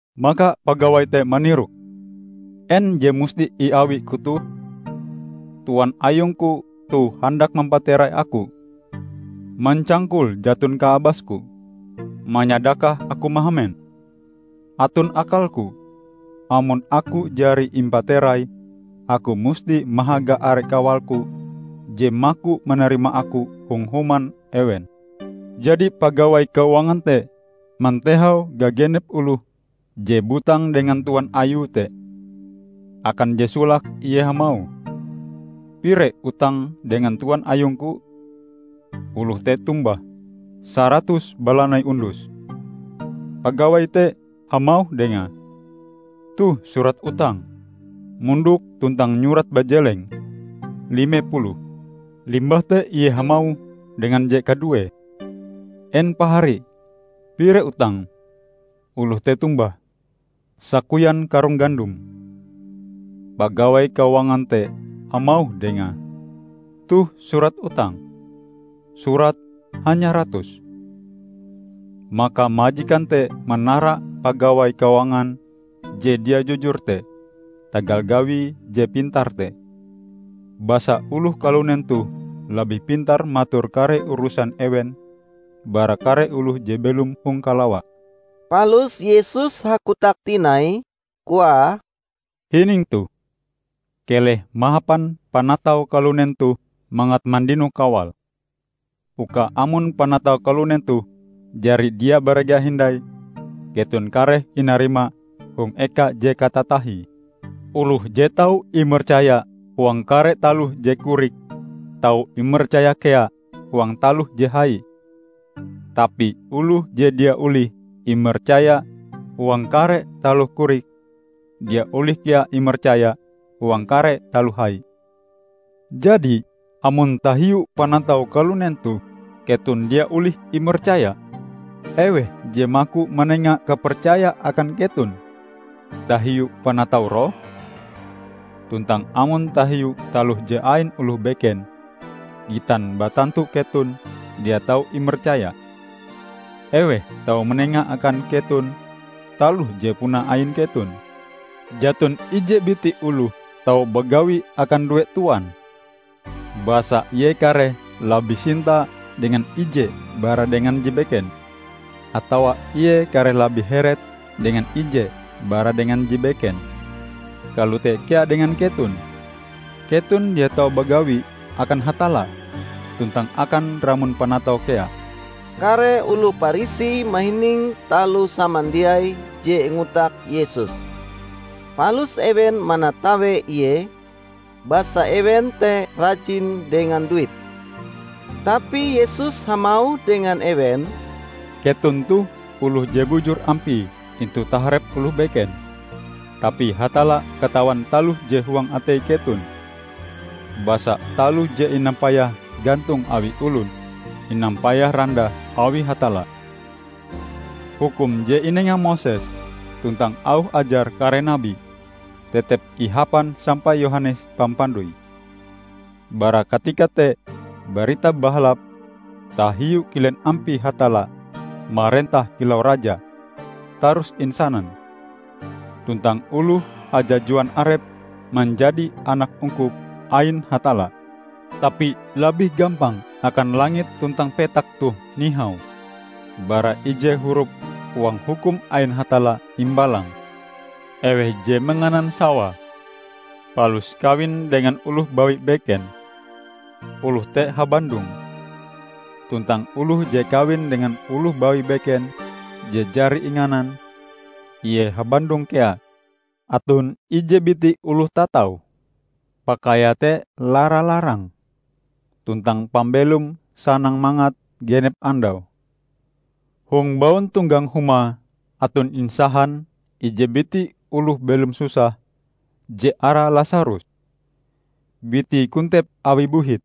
Maka pagawai te manirok, 'En je musti iawiku toh? Tuan ayungku toh handak mampaterai aku. Mancangkul, jaton kaabasku; manyadakah, aku mahamen. Aton akalku; amon aku jari impaterai, aku musti mahaga are kawalku je maku manarima aku hong human ewen!' Jadi pagawai keuangan te mantehau gagenep oloh je butang dengan tuan ayue te. Akan je solake, ie hamauh, 'Pire utangm dengan tuan ayungku?' Oloh te tombah, 'Saratus balanai undus.' Pagawai te hamauh dengae, 'Toh surat utangm. Mondok tuntang nyurat bajeleng: lime puluh.' Limbah te ie hamauh dengan je kaduee, 'En pahari, pire utangm?' Oloh te tombah, 'Sakoyan karung gandom.' Pagawai keuangan te hamauh dengae, 'Toh surat utangm. Surat: hanya ratus.' Maka majikan te manara pagawai keuangan je dia jujur te tagal gawie je pintar te; basa oloh kalunen toh labih pintar mator kare urusan ewen bara kare oloh je belom hong kalawa." Palus Yesus hakotak tinai, koae, "Hining toh! Keleh mahapan panatau kalunen toh mangat mandino kawal, uka amon panatau kalunen toh jari dia barega hindai, keton kareh inarima hong eka je katatahie. Oloh je tau imercaya huang kare taloh je korik, tau imercaya kea huang taloh je hai. Tapi oloh je dia olih imercaya huang kare taloh korik, dia olih kea imercaya huang kare taloh hai. Jadi, amon tahiu panatau kalunen toh keton dia olih imercaya, eweh je maku manenga kapercaya akan keton tahiu panatau roh? Tuntang amon tahiu taloh je ain oloh beken, gitan batantu keton dia tau imercaya, eweh tau manenga akan keton taloh je puna ain keton? Jaton ije biti oloh tau bagawi akan due tuan; basa ie kareh labih sinta dengan ije bara dengan je beken, atawa ie kareh labih heret dengan ije bara dengan je beken. Kalote kea dengan keton. Keton dia tau bagawi akan Hatalla tuntang akan ramon panatau kea." Kare oloh Parisi mahining taloh samandiai je ingotak Yesus. Palus ewen manatawe Ie, basa ewen te rajin dengan duit. Tapi Yesus hamauh dengan ewen, "Keton toh oloh je bujur ampie intu taharep oloh beken, tapi Hatalla katawan taloh je huang atei keton. Basa taloh je inampayah gantong awi olon, inampayah randah awi Hatalla. Hukum je inenga Moses tuntang auh ajar kare nabi, tetep ihapan sampai Yohanes Pampandoi. Bara katika te Barita Bahalap tahiu kilen ampie Hatalla marentah kilau raja tarus insanan. Tuntang oloh hajajuan arepe manjadi anak ungkup ain Hatalla. Tapi labih gampang akan langit tuntang petak toh nihau bara ije hurup huang Hukum ain Hatalla imbalang. Eweh je manganan sawae palus kawin dengan oloh bawi beken, oloh te habandong. Tuntang oloh je kawin dengan oloh bawi beken je jari inganan, ie habandong kea." "Aton ije biti oloh tatau. Pakaiae te lara-larang, tuntang pambelome sanang-mangat genep andau. Hong bauntonggang humae aton insahan ije biti oloh belom susah je arae Lasarus. Bitie kontep awi buhit.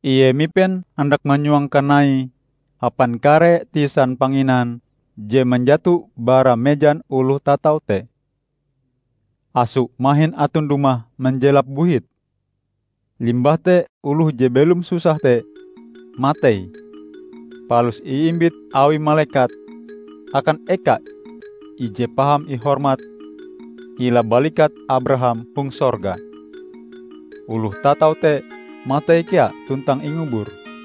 Ie mipen handak manyuang kanaie hapan kare tisan panginan je manjato bara mejan oloh tatau te. Aso mahin aton dumah manjelap buhite. Limbah te oloh je belom susah te matei palus iimbit awi malekat akan eka ije paham ihormat hila balikat Abraham hong sorga. Oloh tatau te matei kea tuntang ingubur.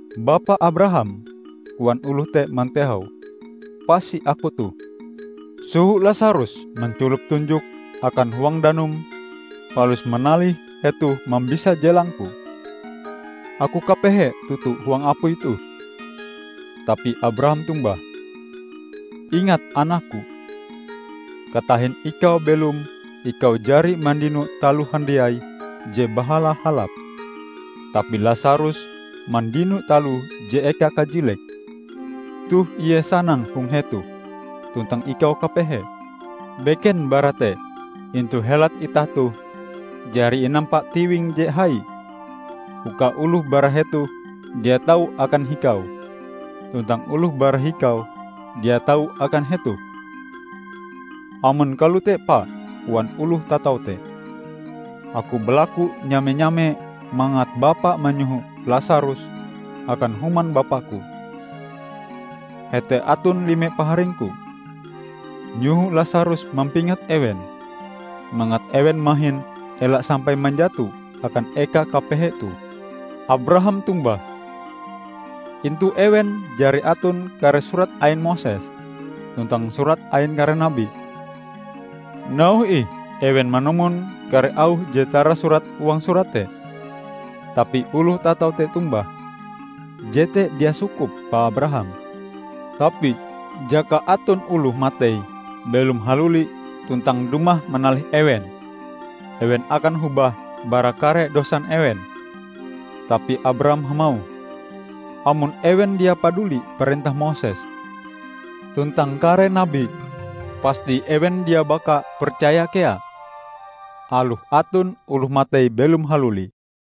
'Bapa Abraham!' koan oloh te mantehau. 'Pasi aku toh. Soho Lasarus manculop tunjoke akan huang danum palus manalih hetoh mambisa jelangku. Aku kapehe toto huang apui toh!' Tapi Abraham tombah, 'Ingat anakku: katahin ikau belom ikau jari mandino taloh handiai je bahala-halap, tapi Lasarus mandino taloh je eka kajilek. Toh ie sanang hong hetoh, tuntang ikau kapehe. Beken bara te, intu helat itah toh jari inampa tiwing je hai, uka oloh bara hetoh dia tau akan hikau tuntang oloh bara hikau dia tau akan hetoh!' 'Amon kalote, Pa,' koan oloh tatau te, 'aku balaku nyame-nyame mangat bapa manyoho Lasarus akan human bapaku. Hete aton lime paharingku. Nyoho Lasarus mampingat ewen, mangat ewen mahin ela sampai manjato akan eka kapehe toh.' Abraham tombah, 'Intu ewen jari aton kare surat ain Moses tuntang surat ain kare nabi! Nauhe ih ewen manumon kare auh je tarasurat huang surat te!' Tapi oloh tatau te tombah, 'Jete dia sukup Pa Abraham. Tapi jaka aton oloh matei belom haluli tuntang dumah manalih ewen, ewen akan hobah bara kare dosan ewen.' Tapi Abraham hamauh, 'Amon ewen dia paduli parentah Moses tuntang kare nabi, pasti ewen dia baka percaya kea, aloh aton oloh matei belom haluli.' "